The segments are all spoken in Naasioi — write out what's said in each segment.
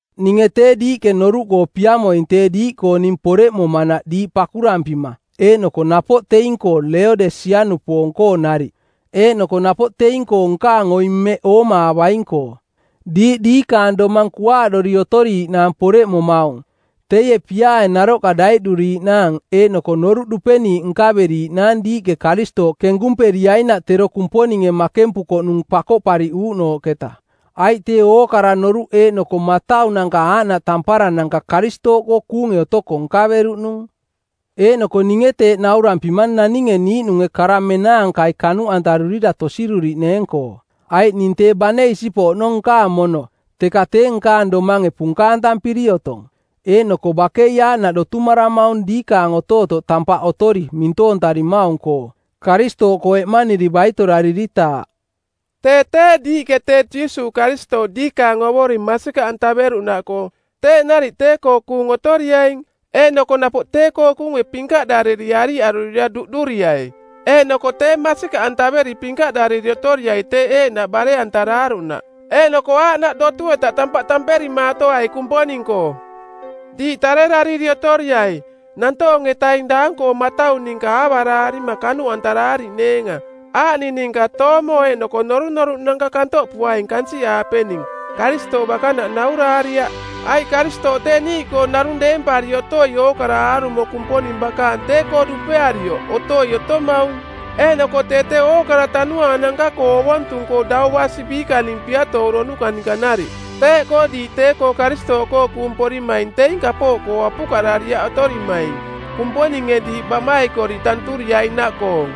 Ninge tee diiꞌke noruꞌkoo piamoing tee diiꞌkoo ning poreꞌmomanaꞌ diiꞌ pakurampima eeꞌnoko napoꞌ teing-koo Leodesiaꞌnupoong-koo nariꞌ, eeꞌnoko napoꞌ teing-koo nkaang oing mmeꞌ oomaavaing-koo. Diiꞌ diikaang domang kuaaꞌdori otoriiꞌnaang poreꞌmomaung, teie piaae naroꞌka daiꞌduriiꞌnaang eeꞌnoko noruꞌ dupeniiꞌ nkaveriiꞌnaang diiꞌke Karistooꞌ kenkumperiainaꞌ tero Kumponinge makempukoꞌnung pakoꞌpariꞌuuꞌnooꞌketa. Aiꞌ tee ookara noruꞌ eeꞌnoko mataunanka aaꞌnaꞌ tamparananka Karistooꞌkoo kuunge otoko nkaveruꞌnung. Eeꞌnoko ninge teeꞌ naurampimang naninge niiꞌnunge kara menaankai kanuꞌantarurira tosiruriꞌneeng-koo. Aiꞌ ning tee bane isipoꞌ oꞌnong nkaang mono, teka tee nkaang domange punkaantampiri otong. Eeꞌnoko bakei aaꞌnaꞌ dotumaramaung diikaang otootoꞌ tampaꞌ otori mintoontarimaung-koo, Karistooꞌkoo eꞌmaniri baitorariritaaꞌ. Tee tee, diiꞌke tee Jiisuuꞌ Karistooꞌ diikaang Ovoring masikaꞌantaveruꞌnaꞌkoo, teeꞌ nariꞌ tee-koo kuung otoriaing. Eeꞌnoko napoꞌ tee-koo kuunge pinkaꞌdariri ariꞌarurira duꞌduriai, eeꞌnoko tee masikaꞌantaveri pinkaꞌdariri otoriai teeꞌ eeꞌnaꞌ bare-antaraaruꞌnaꞌ, eeꞌnoko aaꞌnaꞌ dotu-eta tampaꞌ tamperimaatoai Kumponing-koo. Diiꞌ tarerariri otoriai, nantoong-etaing daang-koong matau ninka aavaraarima kanuꞌantaraariꞌneenga, aaꞌning ninka toomo eeꞌnoko norunoruꞌnanka kantoꞌpuaing kansiꞌaapening, Karistooꞌ bakanaꞌ nauraariaꞌ. Aiꞌ Karistooꞌ tee niiꞌkoo narung deempari otoi ookara aarumo Kumponing bakaang tee-koo dupearioꞌ otoi otomaung, eeꞌnoko tee tee ookara tanuaananka-koo ovontung-koo dau basi biikaning piatooronuka ninka nariꞌ; Teeꞌkoo diiꞌ tee-koo Karistooꞌkoo kuung porimaing teing kapooꞌkoo apukaꞌdariaꞌ otorimaing Kumponinge diiꞌ baꞌmaikoriꞌ tanturiainaꞌkoong.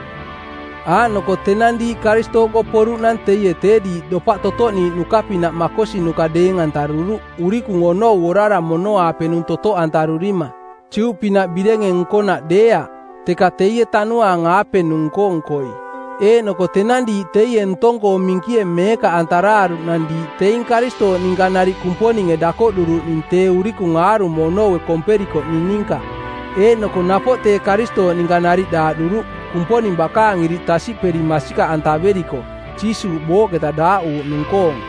Aaꞌnoko tenang diiꞌ Karistooꞌkoo poruꞌnang teie tee diiꞌ dopaꞌ totoꞌniiꞌnuka pinaꞌ makosinuka deeng-antaruruꞌ urikung onou orara mono-aapenung totoꞌantarurima, Juꞌpinaꞌ birenge nkonaꞌ deeaꞌ, teka teie Tanuaang-aapenung nko-nkoi. Eeꞌnoko tenang diiꞌ teie ntong-koo minkie meekaꞌantaraaruꞌnang diiꞌ teing Karistooꞌ ninka nariꞌ Kumponinge dakoꞌduruꞌning tee urikung aarumo onoue komperikoꞌning ninka. Eeꞌnoko napoꞌ tee Karistooꞌ ninka nariꞌ daaꞌduruꞌ, Kumponing bakaang iriꞌ tasiꞌperi masikaꞌantaveriko, Jiisuuꞌ booꞌketa daaꞌuuꞌnung-koong.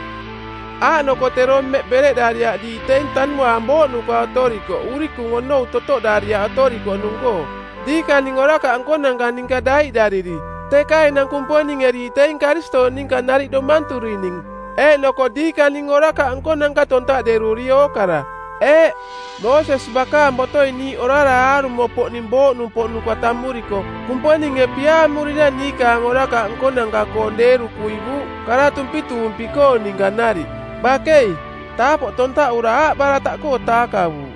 Aaꞌnoko tero mmeꞌ bereꞌdariaꞌ diiꞌ teing tanuaang booꞌnuka otorikoꞌ urikung onou totoꞌdariaꞌ otorikoꞌnung-koo, diikaning orakaꞌ nkonanka ninka daiꞌdariri, teka enang Kumponinge diiꞌ teing Karistooꞌ ninka nariꞌ domanturining eeꞌnoko diikaning orakaꞌ nkonanka tontaꞌderuri ookara. Eeꞌ, Moosesi bakaang botoi niiꞌ orara aarumo-poꞌning booꞌnumpoꞌnuka tammuriko, Kumponinge piaamurira niikaang orakaꞌ nkonanka-koong deeru kuivuuꞌ kara tumpituumpi-koong ninka nariꞌ. Bakei, taapoꞌ tontaꞌura aaꞌbarataꞌkoo taakavuuꞌ.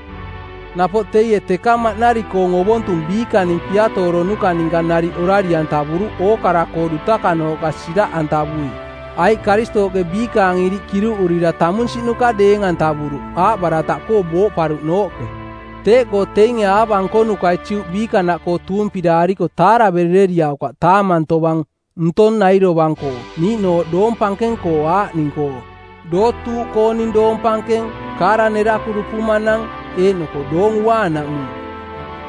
Napoꞌ teie teka maꞌnari-koong ovontung biikaning piatooronuka ninka nariꞌ orari-antavuruꞌ ookara-koo dutakanooꞌka siraꞌantavui, aiꞌ Karistooꞌke biikaang iriꞌ kiruꞌurira tamunsiꞌnuka deeng-antavuruꞌ aaꞌbarataꞌkoo booꞌparuꞌnooꞌke. Teeꞌkoo teinge aava nkonukai Juꞌ biikanaꞌkoo tuumpiraariko taaraverereriaukaꞌ taamang tovang ntong nai dovang-koo, niiꞌnooꞌ doong pankeng-koo aaꞌning-koo: dootuuꞌkooning doong pankeng, kaara neraku dupumanang, eeꞌnoko Doong Uaanaꞌmung.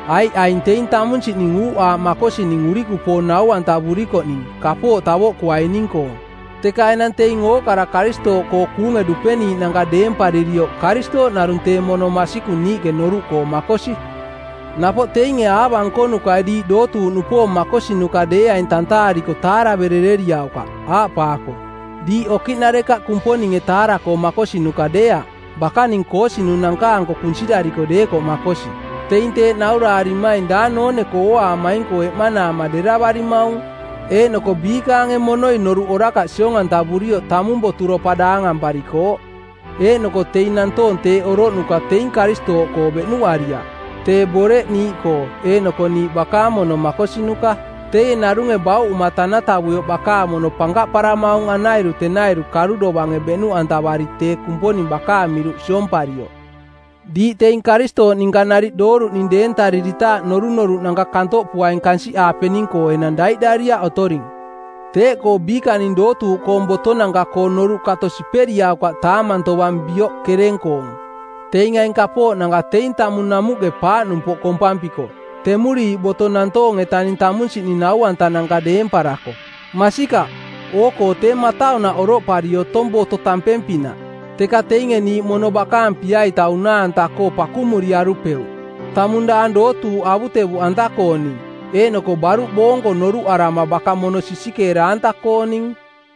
Aiꞌ aing teing tamunsiꞌning uuꞌaaꞌ makosining urikupoong nau-antavurikoꞌning kapooꞌ tavoꞌkuaining-koong, teka enang teing ookara Karistooꞌkoo kuunge dupeniiꞌnanka deemparirioꞌ Karistooꞌ narung tee mono masikung niiꞌke noruꞌkoo makosi. Napoꞌ teinge aava nkonukai diiꞌ dootuuꞌnupoong makosinuka deeaing tantaariko taaraverereriaukaꞌ, aaꞌpaako, “Diiꞌ okiꞌnarekaꞌ Kumponinge taara-koo makosinuka deeaꞌ, bakaning koosinunanka-anko kunsirariko deekoꞌ makosi.” Teing teeꞌ nauraarimaing daang noone-koo ooaamaing-koo eꞌmanaama deravarimaung, eeꞌnoko biikaange monoi noruꞌ orakaꞌ siong-antavurioꞌ tamung boturopa daangamparikooꞌ. Eeꞌnoko teing nantoong teeꞌ oroꞌnuka teing Karistooꞌkoo beꞌnuꞌariaꞌ, tee Boreꞌ niiꞌkoo eeꞌnoko niiꞌ bakaang mono makosinuka. Teie narunge bauꞌuma tanatavuioꞌ bakaang mono pankaꞌparamaung anairu-tenairu karu dovange beꞌnuꞌantavari tee Kumponing bakaang miruꞌ siomparioꞌ. Diiꞌ teing Karistooꞌ ninka nariꞌ dooruꞌning deentariritaaꞌ norunoruꞌnanka kantoꞌpuaing kansiꞌaapening-koo enang daiꞌdariaꞌ otoring. Teeꞌkoo biikaning dootuuꞌkoong botonanka-koo noruꞌ kato siperiaukaꞌ taamang tovang bioꞌ kereng-koong. Teing aing kapooꞌnanka teing tamung namuꞌke paaꞌnumpoꞌ kompampiko, temuriiꞌ boto nantoong-etaning tamunsiꞌning nau-antananka deemparako. Masikaꞌ, oo-koo tee mataunaꞌ oroꞌpari otong boto tampeng-pinaꞌ, teka teinge niiꞌ mono bakaang pia-ita unaa-anta-koo pakumaariarupeuꞌ. Tamung daang dootuuꞌ avutevuꞌanta-kooning, eeꞌnoko baruꞌ boonko noruꞌarama baka mono sisikeera-anta-kooning.